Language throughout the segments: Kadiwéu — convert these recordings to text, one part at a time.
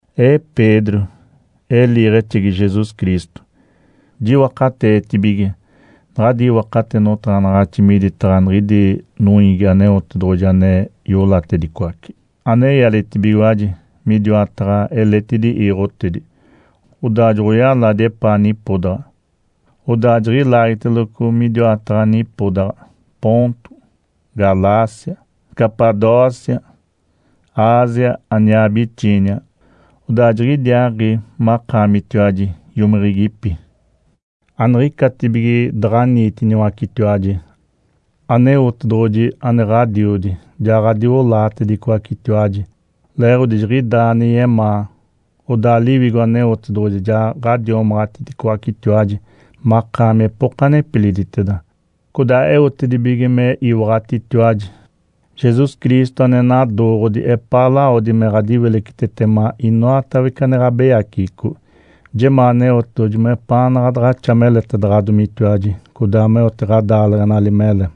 Ee Pedro, ee liiɡ̶exegi Jesus Cristo. Jiwakateetibige naɡ̶adi iwakate notaɡ̶anaɡ̶axi miditaɡ̶a niɡ̶idi noiigi Aneotedoɡ̶oji ane iolatedicoace, ane ialetibigiwaji midiwataɡ̶a eletidi iiɡ̶otedi, odaa joɡ̶oyaladi epaa nipodaɡ̶a. Odaa jiɡ̶ilaagiteloco midiwataɡ̶a nipodaɡ̶a Ponto, Galácia, Capadócia, Ásia aniaa Bitínia. Odaa jiɡ̶idiaaɡ̶i makaamitiwaji iomiɡ̶igipi. Aniɡ̶icatibige daɡ̶aniitiniwacetiwaji, Aneotedoɡ̶oji ane Ǥodiodi, ja ɡ̶adiolaatedicoacetiwaji leeɡ̶odi jiɡ̶idaa ane yemaa. Odaa Liwigo Aneotedoɡ̶oji ja ɡ̶adiomaɡ̶atiticoacetiwaji makaami epoka nepiliditeda, codaa eotedibige me iwaɡ̶atitiwaji Jesus Cristo ane nadooɡ̶odi epaa lawodi me ɡ̶adapitaɡ̶atitetema inoatawece ane ɡ̶abeyaceɡ̶eco. Jemaa Aneotedoɡ̶oji mepaanaɡ̶a daɡ̶axa meletedaɡ̶adomitiwaji, codaa meote ɡ̶adaaleɡ̶enali mele.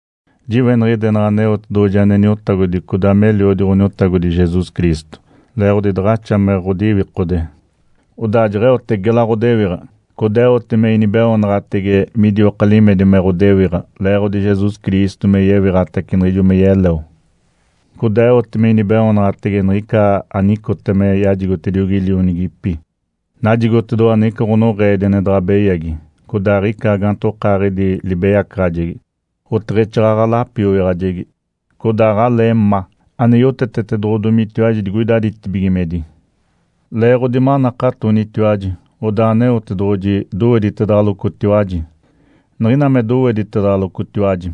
Jiweniɡ̶idenaɡ̶a Aneotedoɡ̶oji ane Niotagodi codaa me Eliodi Ǥoniotagodi Jesus Cristo. Leeɡ̶odi daɡ̶axa me ɡ̶odiwikode, odaa jeɡ̶eote gela ɡ̶odewiɡ̶a, codaa eote me inibeoonaɡ̶atege midioka limedi me ɡ̶odewiɡ̶a leeɡ̶odi Jesus Cristo me yewiɡ̶atace niɡ̶ijo me yeleo. Codaa eote me inibeoonaɡ̶atege niɡ̶ica anicota me yajigotediogi lionigipi. Najigotedoɡ̶owa niɡ̶ina ɡ̶onoɡ̶eedi ane daɡ̶a beyagi, codaa aɡ̶ica gaantokaaɡ̶idi libeyacaɡ̶ajegi, oteɡ̶exaaɡ̶aɡ̶a lapioyaɡ̶ajegi, codaa aɡ̶alee ma, ane yotetetedoɡ̶odomitiwaji digoida ditibigimedi. Leeɡ̶odi manakatonitiwaji, odaa Aneotedoɡ̶oji doweditedaɡ̶alocotiwaji. Niɡ̶ina me doweditedaɡ̶alocotiwaji,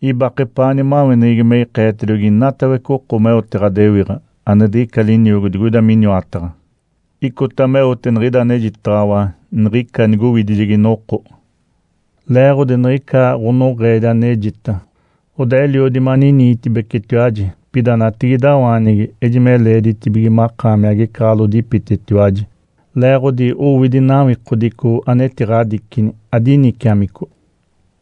ibake epaa nimaweneɡ̶egi me ikeetediogi inatawece oko meote ɡ̶adewiɡ̶a ane diɡ̶ica liniogo digoida miniwataɡ̶a. Icota meote niɡ̶ida anejitaɡ̶awa niɡ̶ica nigowidijegi noko. Leeɡ̶odi niɡ̶ica ɡ̶onoɡ̶eedi anejita, odaa eliodi maniniitibecetiwaji. Pida natigidawaanigi, ejime leeditibige makaami agecaɡ̶alodipitetiwaji, leeɡ̶odi owidi nawikodico anetiɡ̶adicini adiniciamico.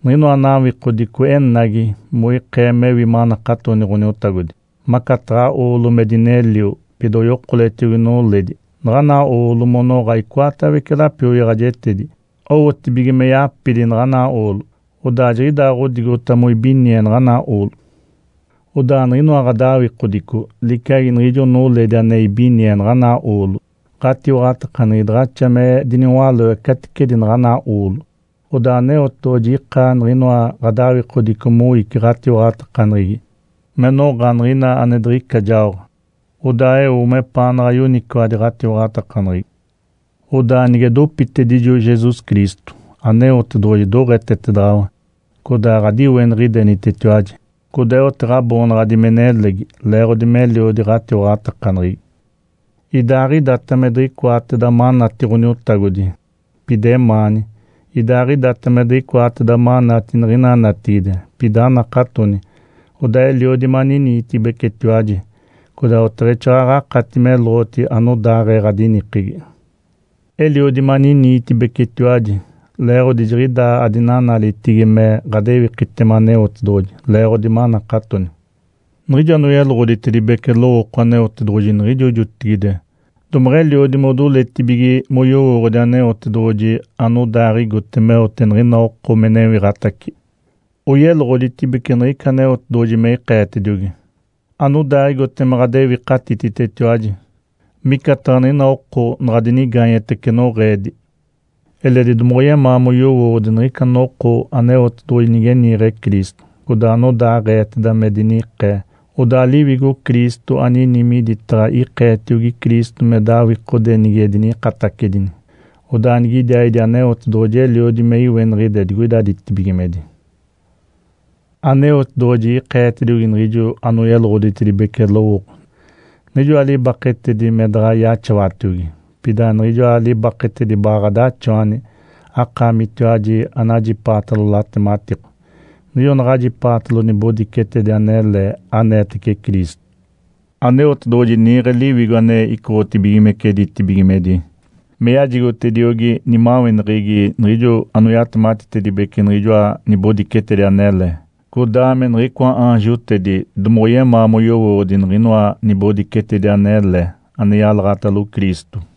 Niɡ̶inoa nawikodico enagi moikee mewi manakatoni Ǥoniotagodi. Macataɡ̶a oolo me dinelio, pida oyokoletiogi noledi naɡ̶ana oolo monoɡ̶a icoatawece lapioyaɡ̶ajetedi, owotibige me yapidi naɡ̶ana oolo. Odaa jiɡ̶idaaɡ̶odigota moibinie naɡ̶ana oolo. Odaa niɡ̶inoa ɡ̶adawikodico liciagi niɡ̶ijo noledi ane ibinie naɡ̶ana oolo. Ǥatiwaɡ̶atakaneɡ̶egi daɡ̶axa me diniwaloe caticedi naɡ̶ana oolo, odaa Aneotedoɡ̶oji ika niɡ̶inoa ɡ̶adawikodico moici ɡ̶atiwaɡ̶atakaneɡ̶egi me noɡ̶a niɡ̶ina ane diɡ̶ica jaoɡ̶a, odaa eo mepaanaɡ̶a yoniciwadi ɡ̶atiwaɡ̶atakaneɡ̶egi. Odaa nige dopitedijo Jesus Cristo, Aneotedoɡ̶oji doɡ̶etetedaɡ̶awa, codaa ɡ̶adiweniɡ̶idenitiwaji, codaa eote ɡ̶aboonaɡ̶adi me nelegi leeɡ̶odi meliodi ɡ̶atiwaɡ̶atakaneɡ̶egi. Idaaɡ̶idata me diɡ̶icoateda manati Ǥoniotagodi, pida emaani. Idaaɡ̶idata me diɡ̶icoateda manati niɡ̶ina natigide, pida anakatoni, odaa eliodi maniniitibecetiwaji, codaa oteɡ̶exaaɡ̶aɡ̶a akati meloɡ̶oti anodaaɡ̶ee ɡ̶adinikegi. Eliodi maniniitibecetiwaji leeɡ̶odi jiɡ̶idaa adinanalitigi me ɡ̶adewikitema Aneotedoɡ̶oji leeɡ̶odi manakatoni. Niɡ̶ijo anoyeloɡ̶oditedibece lowooko Aneotedoɡ̶oji niɡ̶ijo jotigide domeɡ̶eliodi modoletibige moyowooɡ̶odi Aneotedoɡ̶oji anodaaɡ̶igote meote niɡ̶ina oko me newiɡ̶atace. Oyeloɡ̶oditedibece niɡ̶ica Aneotedoɡ̶oji me ikeetediogi anodaaɡ̶igote me ɡ̶adewikatititetiwaji, micataɡ̶a niɡ̶ina oko naɡ̶a dinigaanyetece noɡ̶eedi. Eledi domoɡ̶oyemaa moyowooɡ̶odi niɡ̶ica noko Aneotedoɡ̶oji nige niiɡ̶e Cristo, codaa anodaaɡ̶eeteda me dinikee. Odaa Liwigo Cristo anini miditaɡ̶a ikeetiogi Cristo me dawikode nige dinikatedini, odaa nigidiaaɡ̶idi Aneotedoɡ̶oji eliodi me iweniɡ̶ide digoida ditibigimedi. Aneotedoɡ̶oji ikeetediogi niɡ̶ijo anoyeloɡ̶oditedibece lowooko niɡ̶ijoa libaketedi me daɡ̶a yaxawatiogi, pida niɡ̶ijoa libaketedi baɡ̶a ɡ̶adaxawani akaamitiwaji anajipaatalo latematiko, niɡ̶ijo naɡ̶ajipaatalo nibodicetedi anele aneetece Cristo. Aneotedoɡ̶oji niiɡ̶e Liwigo ane icoɡ̶otibigimece ditibigimedi me yajigotediogi nimaweneɡ̶egi niɡ̶ijo anoyatematitedibece niɡ̶ijoa nibodicetedi anele. Codaa me niɡ̶icoa aanjotedi domoɡ̶oyemaa moyowooɡ̶odi niɡ̶inoa nibodicetedi anele ane yalaɡ̶atalo Cristo.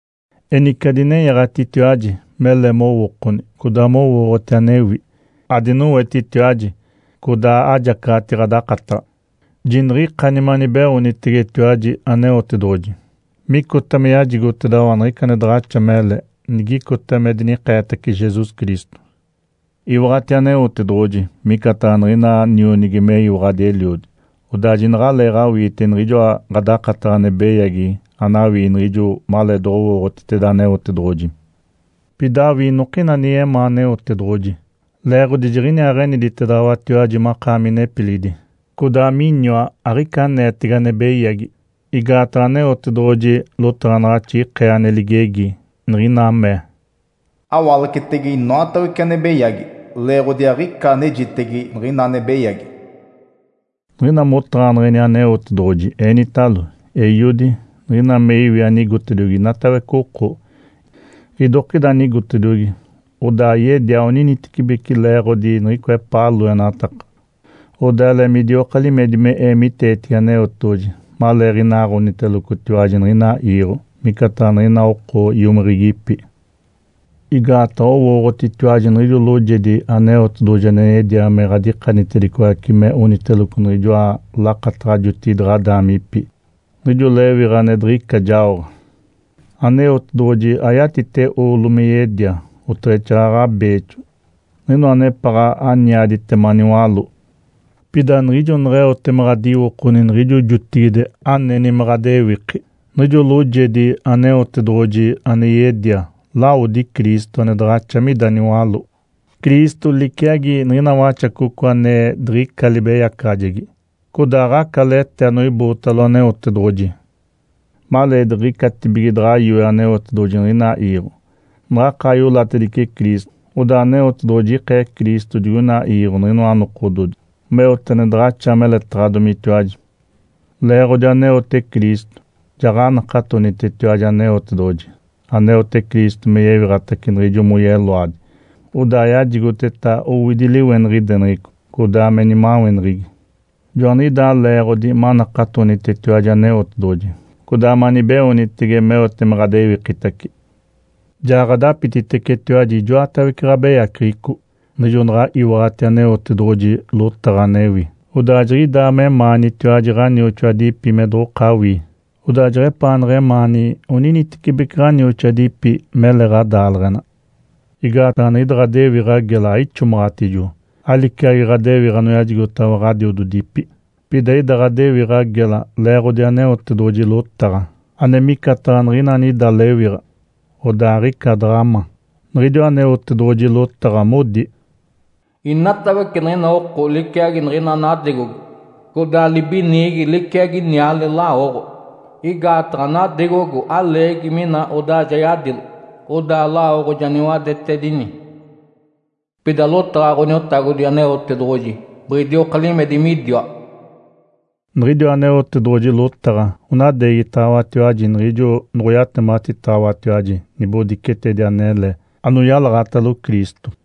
Enice adinenyaɡ̶atitiwaji mele mowookoni codaa mowooɡ̶oti anewi. Adinowetitiwaji, codaa ajacaɡ̶ati ɡ̶adakataɡ̶a. Jiniɡ̶ikani me anibeoonitegetiwaji Aneotedoɡ̶oji micota me yajigotedaɡ̶awa niɡ̶ica ane daɡ̶axa mele nigicota me dinikeetace Jesus Cristo. Iwaɡ̶ati Aneotedoɡ̶oji micataɡ̶a niɡ̶ina nionigi meyiwaɡ̶adi eliodi, odaa jinaɡ̶aleeɡ̶awiite niɡ̶ijoa ɡ̶adakataɡ̶a ane beyagi anawii niɡ̶ijo maleedoɡ̶owooɡ̶otiteda Aneotedoɡ̶oji. Pida awii inokina ane yemaa Aneotedoɡ̶oji, leeɡ̶odi jiɡ̶iniaaɡ̶eniditedaɡ̶awatiwaji makaami nepilidi, codaa miniwa aɡ̶ica aneetege ane beyagi. Igaataɡ̶a Aneotedoɡ̶oji lotaɡ̶anaɡ̶axi ikee ane ligegi, niɡ̶ina mee, “Awalacetege inoatawece ane beyagi, leeɡ̶odi aɡ̶ica anejitege niɡ̶ina ane beyagi.” Niɡ̶ina motaɡ̶aneɡ̶eni Aneotedoɡ̶oji, enitalo, “Eiodi”. Niɡ̶ina me iwi anigotediogi inatawece oko, idokida anigotediogi, odaa yedia oninitecibeci leeɡ̶odi niɡ̶icoa epaa loenataka. Odaa ele midioka limedi me eemiteetigi Aneotedoɡ̶oji maleeɡ̶inaaɡ̶onitelocotiwaji niɡ̶ina iiɡ̶o micataɡ̶a niɡ̶ina oko iomiɡ̶igipi. Igaataɡ̶a owooɡ̶otitiwaji niɡ̶ijo loojedi Aneotedoɡ̶oji ane yedia me ɡ̶adikanitedicoace me oniteloco niɡ̶ijoa lakataɡ̶a jotigide ɡ̶adaamipi, niɡ̶ijo lewiɡ̶a ane diɡ̶ica jaoɡ̶a. Aneotedoɡ̶oji ayatite oolo me yedia, oteɡ̶exaaɡ̶aɡ̶a beexo, niɡ̶inoa anepaɡ̶a aniaditema niwaló. Pida niɡ̶ijo neɡ̶eote me ɡ̶adiwokoni niɡ̶ijo jotigide aneni me ɡ̶adewiki, niɡ̶ijo loojedi Aneotedoɡ̶oji ane yedia, lawodi Cristo, ane daɡ̶axa mida niwaló. Cristo liciagi niɡ̶ina waxacoco ane diɡ̶ica libeyacaɡ̶ajegi codaa aɡ̶aca lete anoibootalo Aneotedoɡ̶oji. Maleediɡ̶icatibige daɡ̶a yoe Aneotedoɡ̶oji niɡ̶ina iiɡ̶o, naɡ̶akaa iolatedice Cristo, odaa Aneotedoɡ̶oji ikee Cristo digoina iiɡ̶o niɡ̶inoa nokododi, meote ane daɡ̶axa meletaɡ̶adomitiwaji. Leeɡ̶odi aneote Cristo, jaɡ̶anakatonitetiwaji Aneotedoɡ̶oji aneote Cristo me yewiɡ̶atace niɡ̶ijo moyeloadi, odaa yajigoteta owidi liweniɡ̶ideneɡ̶eco, codaa me nimaweneɡ̶egi. Joaniɡ̶idaa leeɡ̶odi manakatonitetiwaji Aneotedoɡ̶oji, codaa manibeoonitege meote me ɡ̶adewikitace. Ja ɡ̶adapititecetiwaji ijoatawece ɡ̶abeyaceɡ̶eco niɡ̶ijo naɡ̶a iwaɡ̶ati Aneotedoɡ̶oji lotaɡ̶a anewi, odaa jiɡ̶idaa memaanitiwaji ɡ̶anioxoadipi me doɡ̶okawii. Odaa jeɡ̶epaanaɡ̶a emaani oninitecibeci ɡ̶anioxoadipi mele ɡ̶adaaleɡ̶ena. Igaataɡ̶a niɡ̶ida ɡ̶adewiɡ̶a gela aixomaɡ̶atijo, aliciagi ɡ̶adewiɡ̶a anoyajigotaɡ̶awa ɡ̶adiododipi. Pida ida ɡ̶adewiɡ̶a gela leeɡ̶odi Aneotedoɡ̶oji lotaɡ̶a, ane micataɡ̶a niɡ̶ina anida lewiɡ̶a, odaa aɡ̶ica daɡ̶a ma. Niɡ̶idiwa Aneotedoɡ̶oji lotaɡ̶a modi, “Inatawece niɡ̶ina oko liciagi niɡ̶ina nadegogo, codaa libiniigi liciagi niale lawoɡ̶o. Igaataɡ̶a nadegogo aleegi mina odaa ja yadilo, odaa lawoɡ̶o ja niwadetedini. Pida lotaɡ̶a Ǥoniotagodi Aneotedoɡ̶oji biɡ̶idioka limedi midiwa.” Niɡ̶idiwa Aneotedoɡ̶oji lotaɡ̶a onadeegitaɡ̶awatiwaji niɡ̶ijo noɡ̶oyatematitaɡ̶awatiwaji nibodicetedi anele anoyalaɡ̶atalo Cristo.